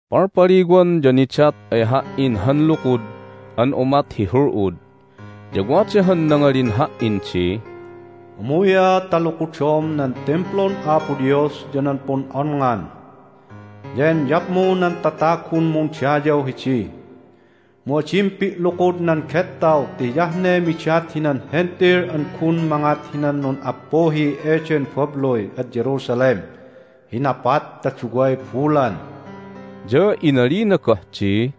Palpaliwan ya nidat ay ha"in han lukud an umat hi hul'ud. Ya wada han nangalin ha"in di, "Umuy'a ta lukudom nan Timplun Apo Dios ya nan pun'onngan, ya enyapmu nan tatagun mundayaw hidi. Mu adim pi'lukud nan gettaw ti hiyah ne midat hinan Hentil an gun mangat hinan nun'appuhi eden babluy ad Jerusalem hi napat ta duway bulan." Ya inalina goh di,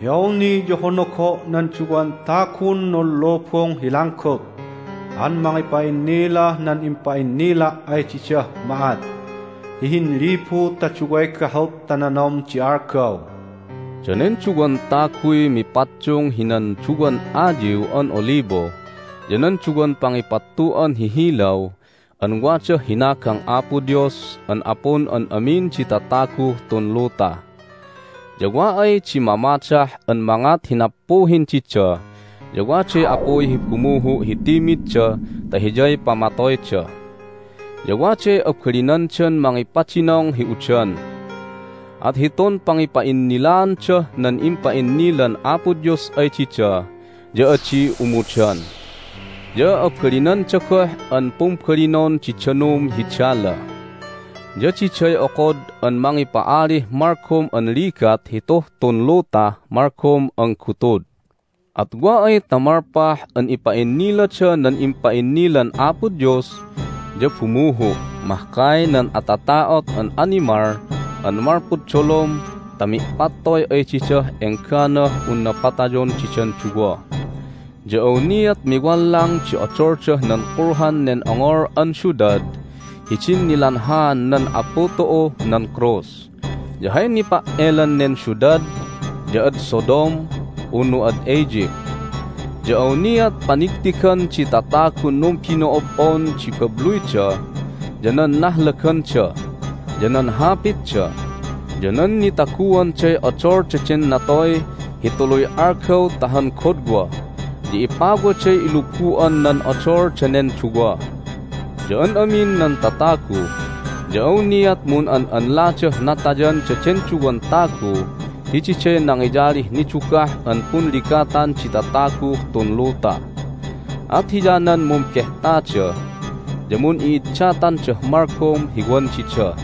"Hi awni ya honogo' nan duwan tagun nunlubung hi langgut an mangipa'innilah nan impa'innila' ay didah ma'at hi hinlibu ta duway gahut ta nanom di algaw." Danen duwan taguy mipaddung hinan duwan ayiw an olibo ya nan duwan pangipattu'an hi hilaw an wadah hinagang Apo Dios an Apun an amin di tataguh tun luta. Ya wa ay di mamadah an mangat hi nappuhin dida ya waday apuy hi bumuhu' hi timidda ta hiyay pamatoyda. Ya waday abalinandan mangipadinong hi udan, at hitun pangipa'innilaandah nan impa'innilan Apo Dios ay dida ya adi umudan. Ya abalinanda goh an pumbalinon di danum hi dala, ya diday okod an mangipa'alih malgom an ligat hituh tun lutah malgom an gutud. At wa ay ta malpah an ipa'innilada nan impa'innilan Apo Dios ya bumuhu' mahkay nan atata'ot an animal an malpud dolom ta mi'pattoy ay didah engganah unna patayon didan duwa. Ya awniat miwallang di odoldah nan kulhan nen ongol an siudad hidin nilanhaan nan Apu tu'uh nan krus. Ya hay nipa"elan nen siudad ya ad Sodom unu ad Egypt. Ya awniat panigtigan di tatagun numbino'ob'on di babluyda, ya nan nahlaganda, ya nan hapitda, ya nan nitaguanday odol daden natoy hi tuluy algaw ta han godwa, ya ipawaday ilubu'an nan odol danen duwa. Ya an amin nan tatagu ya awniat mun'an'anladah natayan daden duwan tagu ti diday nangiyalih nidugah an punligatan di tataguh tun luta. At hiyanan mumbehtada, ya mun'i'iddatandah malgom hi wan dida.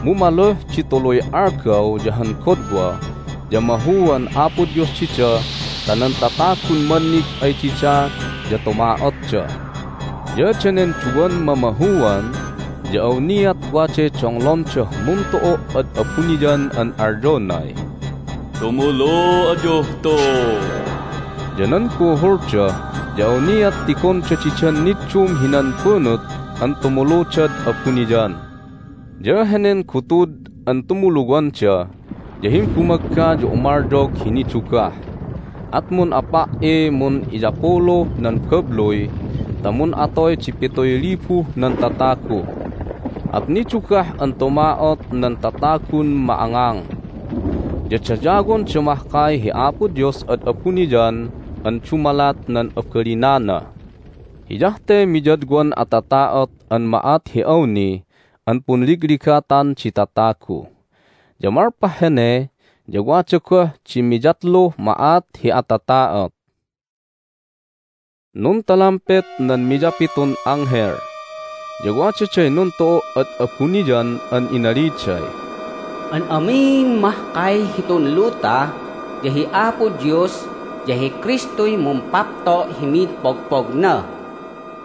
Mu maluh di tuluy algaw ya han godwa ya mahuan Apo Dios dida ta nan tatagun mannig ay dida ya tuma'otda. Ya danen duwan mamahuan ya awniat waday donglondah muntu'u' ad abuniyan an alyonay, "Tumulu ayuh tu!" Ya nan buhulda ya awniat tigonda didan niddum hinan bunut an tumuludad abuniyan. Ya henen gutud an tumuluwanda ya himbumagga ya umalyog hi nidugah, at mun'apa"iy mun'iyapuluh nan babluy ta mun'atoy di pituy libuh nan tatagu. At nidugah an tuma'ot nan tatagun ma'angang, ya dayawonda mahkay hi Apo Dios ad abuniyan an dumalat nan abalinana. Hiyah te miyadwan atata'ot an ma'at hi awni an punligligatan di tatagu. Ya malpah hene ya wada goh di miyatluh ma'at hi atata'ot. Nuntalampet nan miyapitun anghel, ya wadaday nuntu'u' ad abuniyan an inaliday, "An amin mahkay hitun luta ya hi Apo Dios ya hi Kristuy mumpapto' hi mid pogpogna!"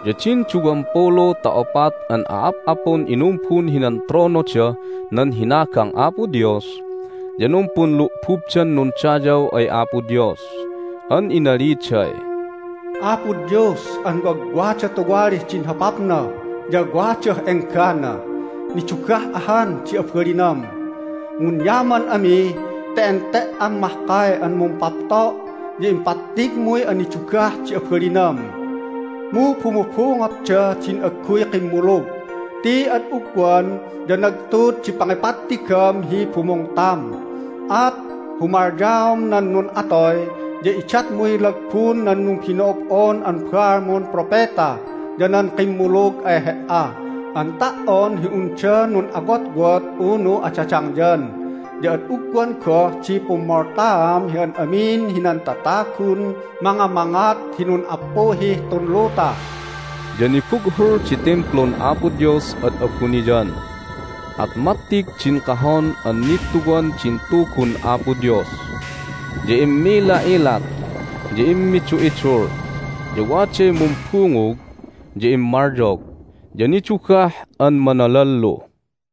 Ya din duwampulu ta opat an a'ap'apun inumbun hinan tronodah nan hinagang Apo Dios ya numpunlu'bubdan nundayaw ay Apo Dios an inaliday, "Apo Dios an wagwada tuwalih din hopapna ya wadah enggana, nidugah ahan di abalinam. Munyaman ami ti ente"am mahkay an mumpapto', ya impattigmuy anidugah di abalinam! Mu bumubungotda din agguy kimmulug ti ad ugwan ya nagtud di pangipattigam hi bumungtam. At humalyaom nan nun'atoy, ya idatmuy lagbun nan numbino'ob'on an baalmun propeta ya nan kimmulug ay He"a an ta"on hi unda nun'awotwot unu adadangyan. Ya ad ugwan goh di pummoltaam hi an amin hinan tatagun mangamangat hi nun'appuhih tun luta!" Ya nibughul di Timplun Apo Dios ad abuniyan, at mattig din Kahon an Nittuwan din Tugun Apo Dios. Ya immila'ilat, ya immidu'idul, ya waday mumbungug, ya immalyog, ya nidugah an manalallu.